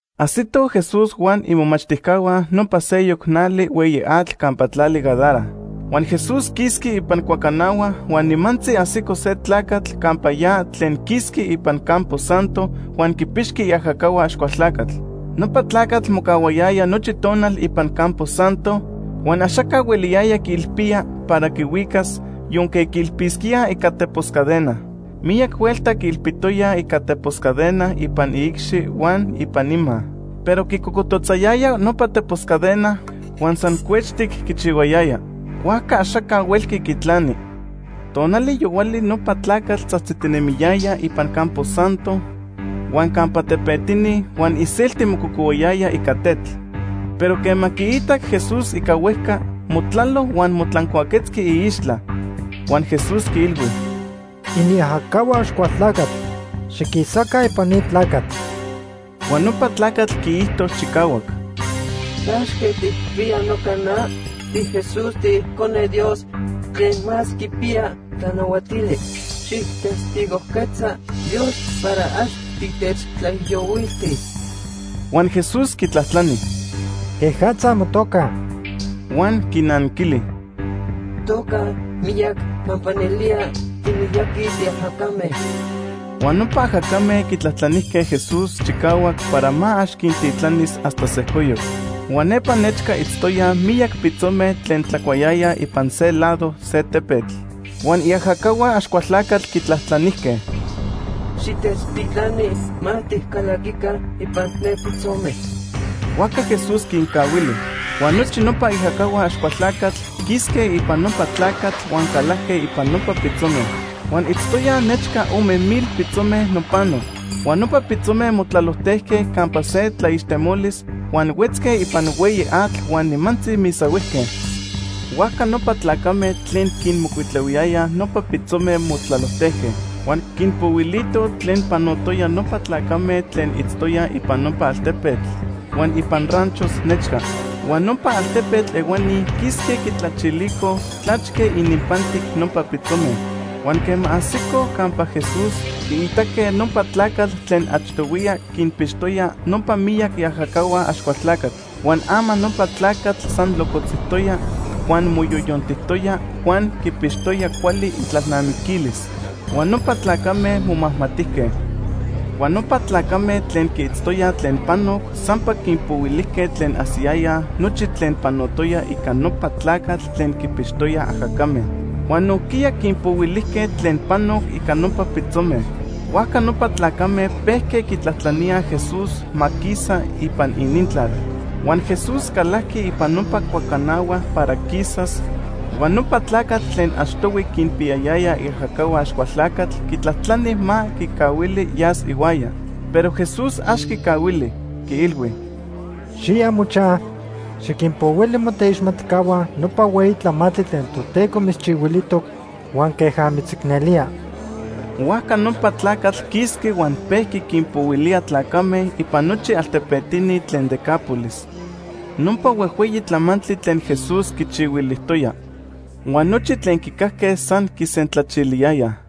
Ajsitoj Jesús huan imomachtijcahua nopa seyoc nali hueyi atl campa tlali Gadara. Huan Jesús quisqui ipan cuacanahua huan nimantzi ajsico se tlacatl campa ya tlen quisqui ipan campo santo huan quipixqui iajacahua Axcualtlacatl. Nopa tlacatl mocahuayaya nochi tonal ipan campo santo, huan axaca hueliyaya quiilpía para quihuicas, yonque quiilpisquía ica tepos cadena. Miyac huelta quiilpitoyaj ica tepos cadena ipan iicxi huan ipan ima, pero quicocototzayaya nopa tepos cadena, huan san cuechtic quichihuayaya. Huajca axaca huelqui quitlani. Tonali yohuali nopa tlacatl tzajtzitinemiyaya ipan campo santo huan campa tepetini huan iselti mococohuayaya ica tetl. Pero quema quiitac Jesús ica huejca, motlalo huan motlancuaquetzqui iixtla. Huan Jesús quiilhui: ―Iniajacahua Axcualtlacatl, xiquisaca ipan ni tlacatl. Huan nopa tlacatl quiijto chicahuac: ―¿Tlachque tijpiya noca na? TiJesús, tiIcone Dios Tlen Más Quipiya Tlanahuatili. Xijtestigojquetza Dios para ax titechtlaijiyohuiltis. Huan Jesús quitlajtlani: ―¿Quejatza motoca? Huan quinanquili: ―Notoca, Miyac, pampa nelía timiyaqui tiajacame. Huan nopa ajacame quitlajtlanijque Jesús chicahuac para ma ax quintitlanis hasta sejcoyoc. Huan nepa nechca itztoyaj miyac pitzome tlen tlacuayayaj ipan se lado se tepetl. Huan iajacahua Axcualtlacatl quitlajtlanijque: ―Xitechtitlani ma ticalaquica ipan ne pitzome. Huajca Jesús quincahuili. Huan nochi nopa iajacahua Axcualtlacatl quisque ipan nopa tlacatl huan calajque ipan nopa pitzome. Huan itztoyaj nechca ome mil pitzome nopano. Huan nopa pitzome motlalojtejque campa se tlaixtemolis, huan huetzque ipan hueyi atl huan nimantzi misahuijque. Huajca nopa tlacame tlen quinmocuitlahuiyayaj nopa pitzome motlalojtejque huan quinpohuilitoj tlen panotoya nopa tlacame tlen itztoyaj ipan nopa altepetl huan ipan ranchos nechca. Huan nopa altepetl ehuani quisque quitlachilicoj tlachque ininpantic nopa pitzome. Huan quema ajsicoj campa Jesús, quiitaque nopa tlacatl tlen achtohuiya quinpixtoya nopa miyac iajacahua Axcualtlacatl. Huan ama nopa tlacatl san locotzijtoya, huan moyoyontijtoya huan quipixtoya cuali itlalnamiquilis. Huan nopa tlacame momajmatijque. Huan nopa tlacame tlen quiitztoyaj tlen panoc sampa quinpohuilijque tlen ajsiyayaj nochi tlen panotoya ica nopa tlacatl tlen quinpixtoya ajacame. Huan nojquiya quinpohuilijque tlen panoc ica nopa pitzome. Huajca nopa tlacame pejque quitlajtlaníaj Jesús ma quisa ipan inintlal. Huan Jesús calajqui ipan nopa cuacanahua para quisas, huan nopa tlacatl tlen achtohui quinpiyayaya iajacahua Axcualtlacatl quitlajtlani ma quicahuili yas ihuaya. Pero Jesús ax quicahuili. Quiilhui: ―Xiya mochaj, xiquinpohuili moteixmatcahua nopa hueyi tlamantli tlen Toteco mitzchihuilijtoc huan queja mitzicnelía. Huajca nopa tlacatl quisqui huan pejqui quinpohuilía tlacame ipan nochi altepetini tlen Decápolis nopa huejhueyi tlamantli tlen Jesús quichihuilijtoya. Huan nochi tlen quicajque san quisentlachiliyayaj.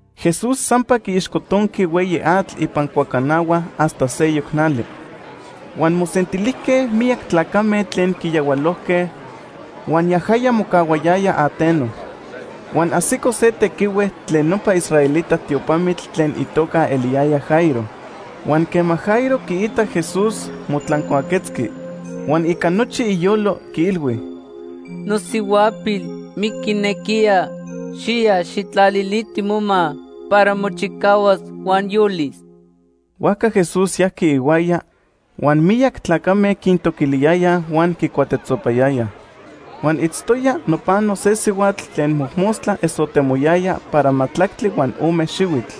Jesús sampa quiixcotonqui hueyi atl ipan cuacanahua hasta seyoc nali. Huan mosentilijque miyac tlacame tlen quiyahualojque huan yajaya mocahuayaya ateno. Huan ajsico se tequihue tlen nopa israelita tiopamitl tlen itoca eliyaya Jairo. Huan quema Jairo quiitac Jesús, motlancuaquetzqui, huan ica nochi iyolo, quiilhui: ―Nosihuapil miquinequiya. Xiya, xijtlaliliti moma para mochicahuas huan yolis. Huajca Jesús yajqui ihuaya, huan miyac tlacame quintoquiliyayaj huan quicuatetzopayayaj. Huan itztoya nopano se sihuatl tlen mojmostla esotemoyaya para majtlactli huan ome xihuitl.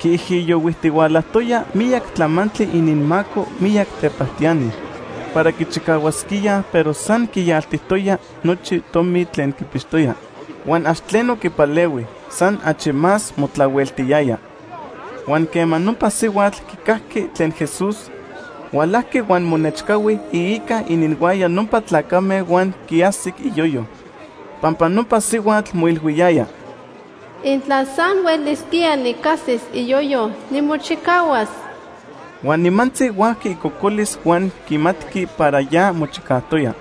Quiijiyohuijtihualajtoya miyac tlamantli ininmaco miyac tepajtiani para quichicahuasquíaj pero san quiyaltijtoya nochi tomi tlen quipixtoya, huan ax tleno quipalehui. San achi más motlahueltiyaya. Huan quema nopa sihuatl quicajqui tlen Jesús, hualajqui huan monechcahui iica ininhuaya nopa tlacame huan quiajsic iyoyo. Pampa nopa sihuatl moilhuiyaya: “Intla san huelisquía nicajsis iyoyo, nimochicahuas.” Huan nimantzi huajqui icocolis huan quimatqui para ya mochicajtoya.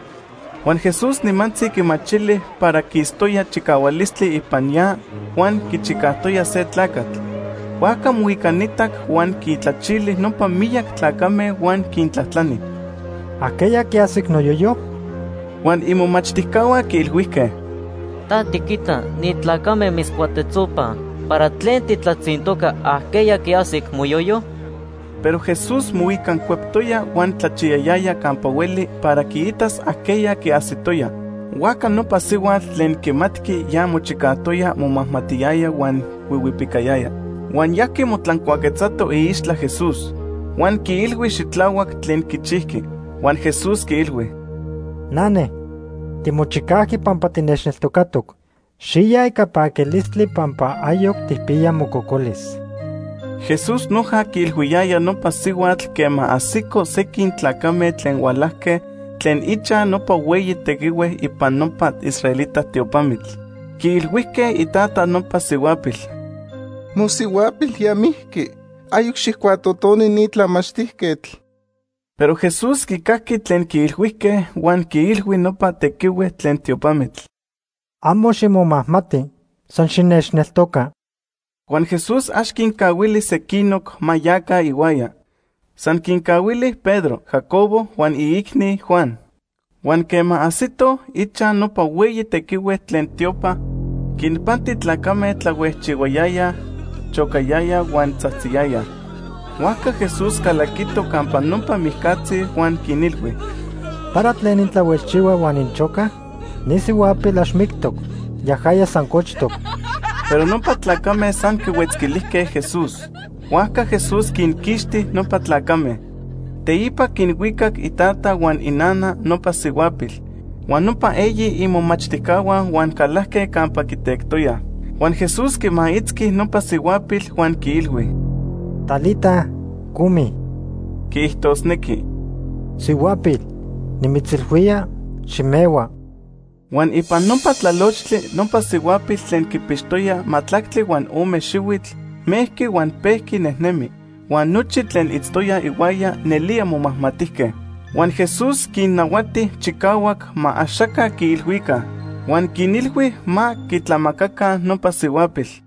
Huan Jesús nimantzi quimachili para quistoya chicahualistli ipan ya huan quichicajtoya se tlacatl. Huajca moicanitac, huan quintlachili nopa miyac tlacame huan quintlajtlani: ―¿Ajqueya quiajsic noyoyo? Huan imomachtijcahua quiilhuijque: ―Ta tiquita ni tlacame mitzcuatetzopaj, ¿para tlen titlatzintoca, ajqueya quiajsic moyoyo? Pero Jesús moicancueptoya huan tlachiyayaya campa hueli para quiitas ajqueya quiajsitoya. Huajca nopa sihuatl tlen quimatqui ya mochicajtoya momajmatiyaya huan huihuipicayaya. Huan yajqui motlancuaquetzato iixtla Jesús huan quiilhui xitlahuac tlen quichijqui. Huan Jesús quiilhui: ―Nane, timochicajqui pampa tinechneltocatoc. Xiya ica paquilistli pampa ayoc tijpiya mococolis. Jesús noja quiilhuiyaya nopa sihuatl quema ajsicoj sequin tlacame tlen hualajque tlen ichaj nopa hueyi tequihue ipan nopa israelita tiopamitl. Quiilhuijque itata nopa sihuapil: ―Mosihuapil ya mijqui. Ayoc xijcuatotoni ni tlamachtijquetl. Pero Jesús quicajqui tlen quiilhuijque huan quiilhui nopa tequihue tlen tiopamitl: ―Amo ximomajmati, san xinechneltoca. Huan Jesús ax quincahuili sequinoc ma yaca ihuaya. San quincahuili Pedro, Jacobo huan iicni, Juan. Huan quema ajsitoj ichaj nopa hueyi tequihue tlen tiopa, quinpanti tlacame tlahuejchihuayayaj, chocayayaj huan tzajtziyayaj. Huajca Jesús calaquito campa nopa mijcatzi huan quinilhui: ―¿Para tlen intlahuejchihuaj huan inchocaj? Ni sihuapil ax mictoc, yajaya san cochtoc. Pero nopa tlacame san quihuetzquilijque Jesús. Huajca Jesús quinquixti nopa tlacame. Teipa quinhuicac itata huan inana nopa sihuapil, huan nopa eyi imomachtijcahua huan calajque campa quitectoyaj. Huan Jesús quimaitzqui nopa sihuapil huan quiilhui: ―Talita, cumi (quiijtosnequi: ‘Sihuapil, nimitzilhuía: ximehua.’) Huan ipan nopa tlalochtli nopa sihuapil tlen quipixtoya majtlactli huan ome xihuitl, mejqui huan pejqui nejnemi, huan nochi tlen itztoyaj ihuaya nelía momajmatijque. Huan Jesús quinnahuati chicahuac ma axaca quiilhuica. Huan quinilhui ma quitlamacaca nopa sihuapil.